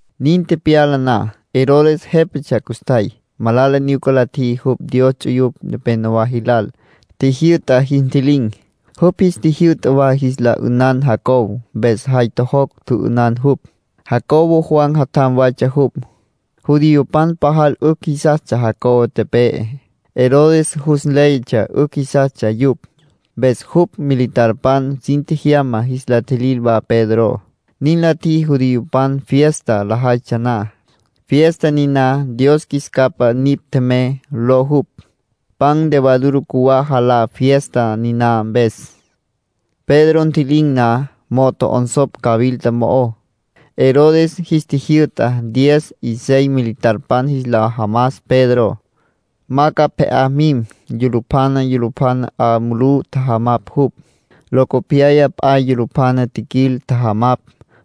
Nin tepyala na, Herodes jépatsja custjay. Malala nyuca la tjiji jupj Dios ts'uyupj nepenowá jilal. Tjijyü'ta jis ntji'lin̈. Jupj jis tjijyü'ta wa jis la 'ünan Jacobo, mpes jay tjojocj tjü'ünan jupj. Jacobo Juan jatjam waytsja jupj. Judiopan pajal 'ücj jisastsja Jacobo tepe'e. Herodes jus nléyatsja 'ücj jisastsja yupj. Mpes jupj militarpan sin tjejyama jis la tjilil wa Pedro. Nin la tjiji judiopan fiesta lajaytsja na. Fiesta niná “Dios Qjuis Capa Nipj Tjemey” ló jupj. Pan levadura cjuwá jalá fiesta niná mpes. Pedro ntji'lin̈ na, mo'o tjo'onsopj cawilta mo'ó. Herodes jis tjijyü'ta diez y seis militarpan jis la jamas Pedro, ma ca pje'á mim. Yulupjana yulupjana 'a mulú tjajamapj jupj. Locopyaya p'a yulupjana tjiquil, tjajamapj.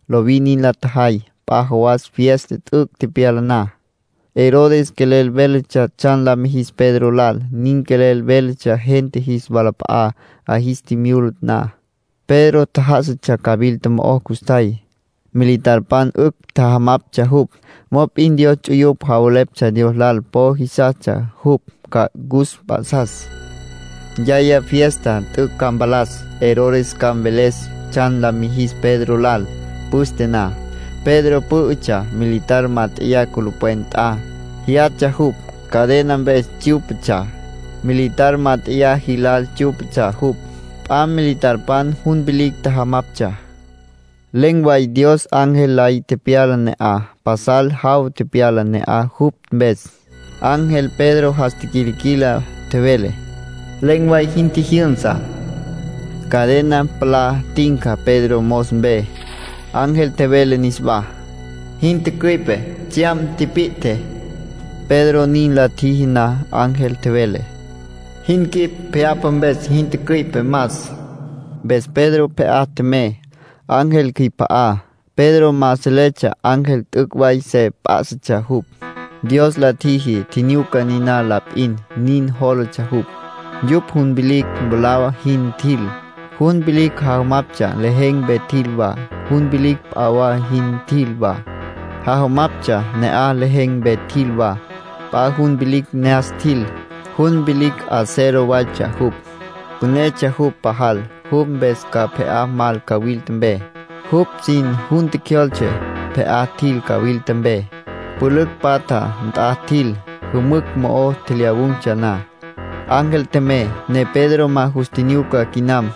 Lovin nin la tjajay. P'a jawas fiesta t'üc' tepyala na, Herodes quelel véletsja tsjan la mijis Pedro lal. Nin quelel véletsja gente jis walap'a'á, 'a jis tjimyula na. Pedro tjá'asatsja cawilta mo'ó custjay. Militarpan 'ücj tjajamaptsja jupj. Mop'in Dios ts'uyupj javeleptsja Dios lal po jisastsja jupj ca cus mp'a'sas. Yaya fiesta t'üc' ca mpalas, Herodes ca mveles tsjan la mijis Pedro lal. Püste na, Pedro pǘ'ütsja militar mát'eya culupwen nt'a, jyatsja jupj. Cadena mpes tsyú'patsja. Militar mát'eya jilal tsyú'patsja jupj. P'a militarpan jun vilicj tjajamaptsja. Len̈ way Dios ángel lay tepyala ne'aj. Pasal jaw tepyala ne'aj jupj mpes. Ángel Pedro jas tiquilquila, tjevele: “Len̈ way jin tjijyünsa”. Cadena palá tinca Pedro mos mpe. Ángel tjevele niswá: “Jin tücüi'pe. Tsjyam tipi'tje.” Pedro nin la tjiji na, ángel tjevele: “Jin quip pje'apa mpes jin tücüi'pe. Mas.” Mpes Pedro pje'á tjemey, ángel cjüip'a'á. Pedro ma seletsja ángel t'üc' way se p'á'satsja jupj. Dios la tjiji tjinyuca niná la p'in, nin jólatsja jupj. Yupj jun vilicj mwalá jin tjil, jun vilicj jajamaptsja lejen̈ mpe tjil wa. Jun vilicj p'a wa jin tjil wa, jajamaptsja ne'aj lejen̈ mpe tjil wa. P'a jun vilicj ne'as tjil, jun vilicj acero waytsja jupj. Pünetsja jupj pajal. Jupj mpes ca pje'á mal cawilta mpe. Jupj sin jun tjecjyoltse. Pje'á tjil cawilta mpe, pülücj patja nt'a tjil. Jümücj mo'o tjelyawun̈tsja na, ángel tjemey, ne Pedro ma jus tjinyuca quinam.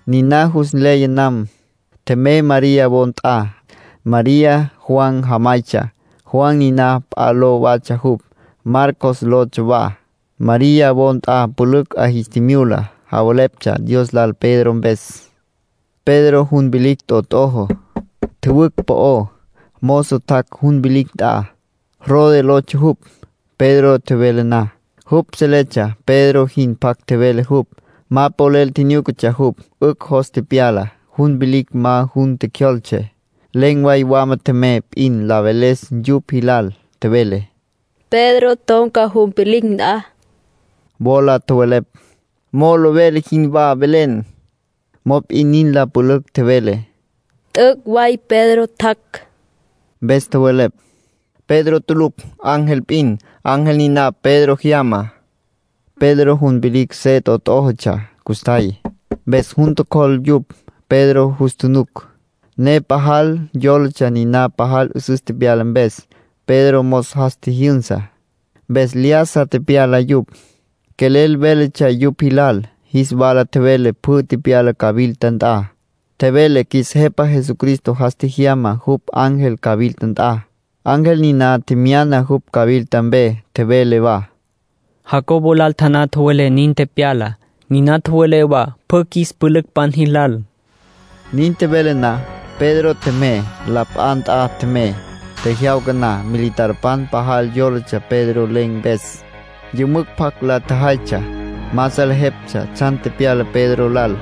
Niná jus nleya nam, tjemey María wo nt'a. María Juan jamaytsja. Juan niná p'a ló watsja jupj, Marcos lotsja wa. María wo nt'a pülücj 'a jis tjimyula, javeleptsja Dios lal Pedro mpes. Pedro jun vilicj t'ot'ojo, tjüwücj po'ó. Mozo tjac' jun vilicj nt'a. Rode lotsja jupj. Pedro tjevele na, jupj seletsja Pedro jin pjac tjevele jupj. Ma polel nyúcatsja jupj. 'Ücj jos tepyala. Jun vilicj ma jun tjecjyoltse, len̈ way wama tjemey p'in la veles yupj jilal. Tjevele: —Pedro ton̈ca jun vilicj nt'a. Wola tjowelepj: —Molo vele jinwá velen. Mop'in nin la pülücj tjevele: —T'üc' way Pedro tjac'. Mpes tjowelepj: —Pedro tulucj. Ángel p'in. Ángel niná Pedro jyama. Pedro jun vilicj se t'ot'ójotsja custjay. Mpes jun tjocjol yupj. Pedro jus tjunuc, ne pajal yólatsja niná pajal 'üsüs tepyala mpes. Pedro mos jas tjijyünsa, mpes lyájasa tepyala yupj. Quelel véletsja yupj jilal. Jis wala tjevele pjü tepyalá cawilta nt'a. Tjevele qjuis Jepa Jesucristo jas tjejyama jupj ángel cawilta nt'a, ángel niná tjemyana jupj cawilta mpe. Tjevele wa: —Jacobo lal taná tjowelé nin tepyalá. Niná tjowelé wa pjü qjuis pülücpan jilal. Nin tjevele na, Pedro tjemey, la p'a nt'a tjemey. Tjejyawca na, militarpan pajal yólatsja Pedro len̈ mpes. Yümücj pjac la tjajaytsja. Ma salejeptsja tsjan tepyala Pedro lal.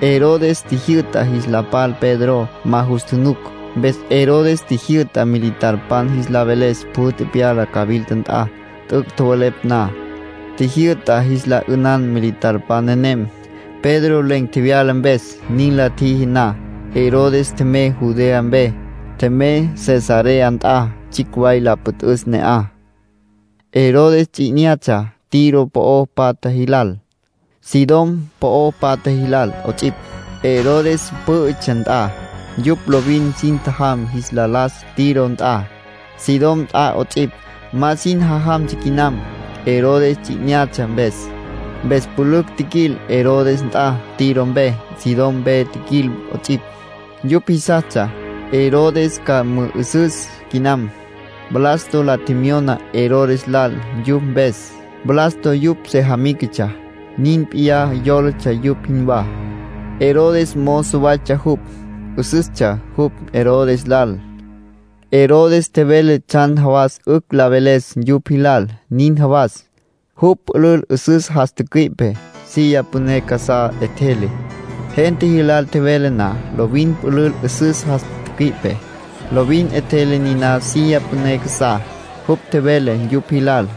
Herodes tjijyü'ta jis la pal Pedro. Ma jus tjunuc. Mpes Herodes tjijyü'ta militarpan jis la veles pjü tepyalá cawilta nt'a. T'üc' tjowelepj na, tjijyü'ta jis la 'ünan militarpan nenem, Pedro len̈ tjevyala mpes. Nin la tjiji na, Herodes tjemey Judea mpe. Tjemey Cesarea nt'a tsjicj way la püt'üs ne'aj. Herodes ts'i 'inyatsja Tiro po'o patja jilal, Sidón po'o patja jilal 'ots'ipj. Herodes pǘ'ütsja nt'a, yupj lovin sin tjajam jis la las Tiro nt'a, Sidón nt'a 'ots'ipj. Ma sin jajamtsja quinam, Herodes ts'i 'inyatsja mpes. Mpes pülücj tjiquil Herodes nt'a Tiro mpe, Sidón mpe tjiquil 'ots'ipj. Yupj jisastsja Herodes ca mü'ü'üsüs quinam. Blasto la tjemyona Herodes lal yupj mpes. Blasto yupj sejamícatsja, nin p'iyá jólatsja yupj jinwá. Herodes mozo waytsja jupj, 'üsüstsja jupj Herodes lal. Herodes tjevele tsjan jawas 'ücj la veles yupj jilal. Nin jawas, jupj pülül 'üsüs jas tücüi'pe, silla püné casá 'etjele. Gente jilal tjevele na, lovin pülül 'üsüs jas tücüi'pe, lovin 'etjele niná silla püné casá. Jupj tjevele yupj jilal.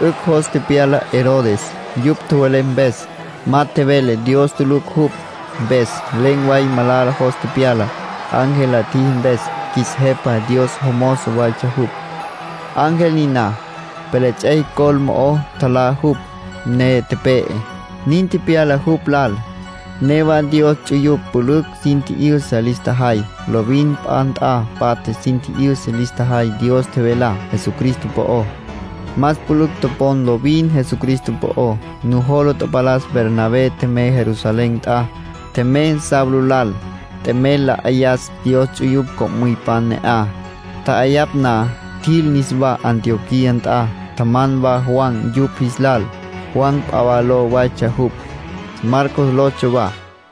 'Ücj jos tepyala Herodes, yupj tjowelepj mpes. Ma tjevele dios tulucj jupj. Mpes len̈ way malala jos tepyala, ángel la tjiji mpes (qjuis Jepa Dios jomozo waytsja jupj, ángel niná). Pelets'ey col mo'o tjalá jupj, ne tepe'e. Nin tepyala jupj lal. Newa Dios ts'uyupj pülücj sin tji'yüsa lis tjajay. Lovin p'a nt'a patja sin tji'yüsa lis tjajay Dios tjevelá Jesucristo po'ó. Más pülücj topon lovin Jesucristo po'ó. Nujola tapalas Bernabé tjemey Jerusalén nt'a. Tjemey Saulo lal, t'emel la 'ayas Dios ts'uyupj co'müypan ne'aj. Tja'ayapj na, tjil niswá Antioquía nt'a. Tjaman wa Juan yupj jis lal. Juan p'a ló waytsja jupj, Marcos lotsja wa.